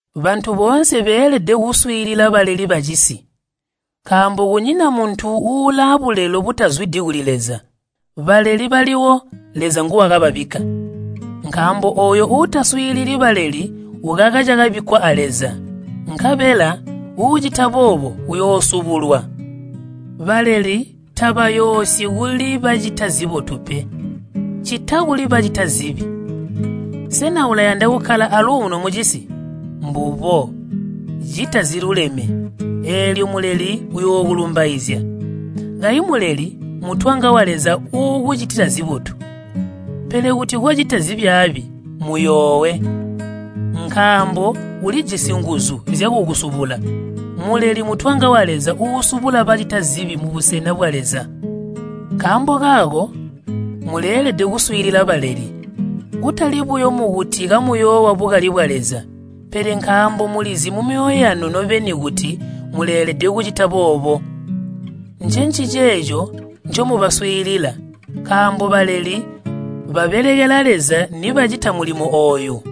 Bantu boonse beelede kuswiilila baleli bacisi. Nkaambo kunyina muntu uulaa bulelo butazwidi kuli Leza. Baleli baliwo Leza nguwakababikka. Nkaambo ooyo uutaswiilili baleli ukaka cakabikkwa a Leza. Nkabela uucita boobo uyoosubulwa. Baleli tabayoosyi kuli bacita zibotu pe, ccita kuli bacita zibi. Sena ulayanda kukkala aluumuno mucisi? Mbubo cita ziluleme, eelyo muleli uyookulumbaizya. Kayi muleli mutwanga wa Leza uukucitila zibotu. Pele kuti kocita zibyaabi, muyoowe, nkaambo ulijisi nguzu zyakukusubula. Muleli mutwanga wa Leza uusubula bacita zibi mubusena bwa Leza. Nkaambo kaako muleelede kuswiilila baleli, kutali buyo mukuti kamuyoowa bukali bwa Leza, pele nkaambo mulizi mumyoyo yanu nobeni kuti muleelede kucita boobo. Ncenciceeco ncomubaswiilila, nkaambo baleli babelekela Leza nibacita mulimo ooyu.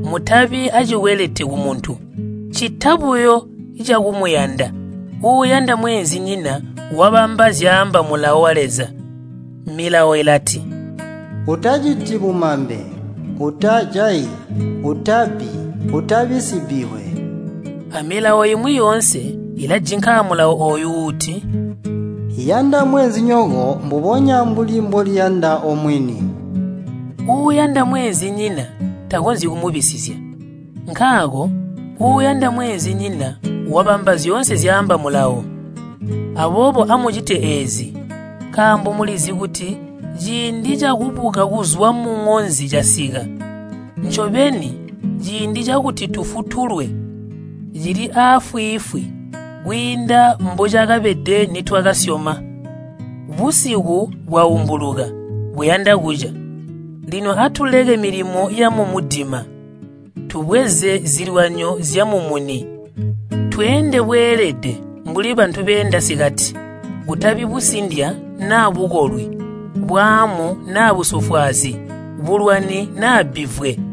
Mutabi acikwelete kumuntu, ccita buyo cakumuyanda. Uuyanda mweenzinyina wabamba zyaamba Mulawo wa Leza. Milawo ilati, “Utaciti bumambe, utajayi, utabbi, utabi sibbivwe,” amilawo imwi yoonse ilajinka amulawo ooyu uuti, “Yanda mweenzinyoko mbubonya mbuli mboliyanda omwini.” Uuyanda mweenzinyina takonzyi kumubisizyae. Nkaako uuyanda mweenzinyina wabamba zyoonse zyaamba Mulawo. Aboobo amucite eezi, nkaambo mulizi kuti ciindi cakubuka kuzwa muŋonzi casika. Ncobeni, ciindi cakuti tufutulwe cili aafwiifwi kwiinda mbocakabede nitwakasyoma. Busiku bwaumbuluka, buyanda kuca. Lino atuleke milimo yamumudima, tubweze zilwanyo zyamumuni. Tweende bweelede mbuli bantu beenda sikati. Kutabi busindya naa bukolwi, bwaamu naa busofwaazi, bulwani naa bbivwe.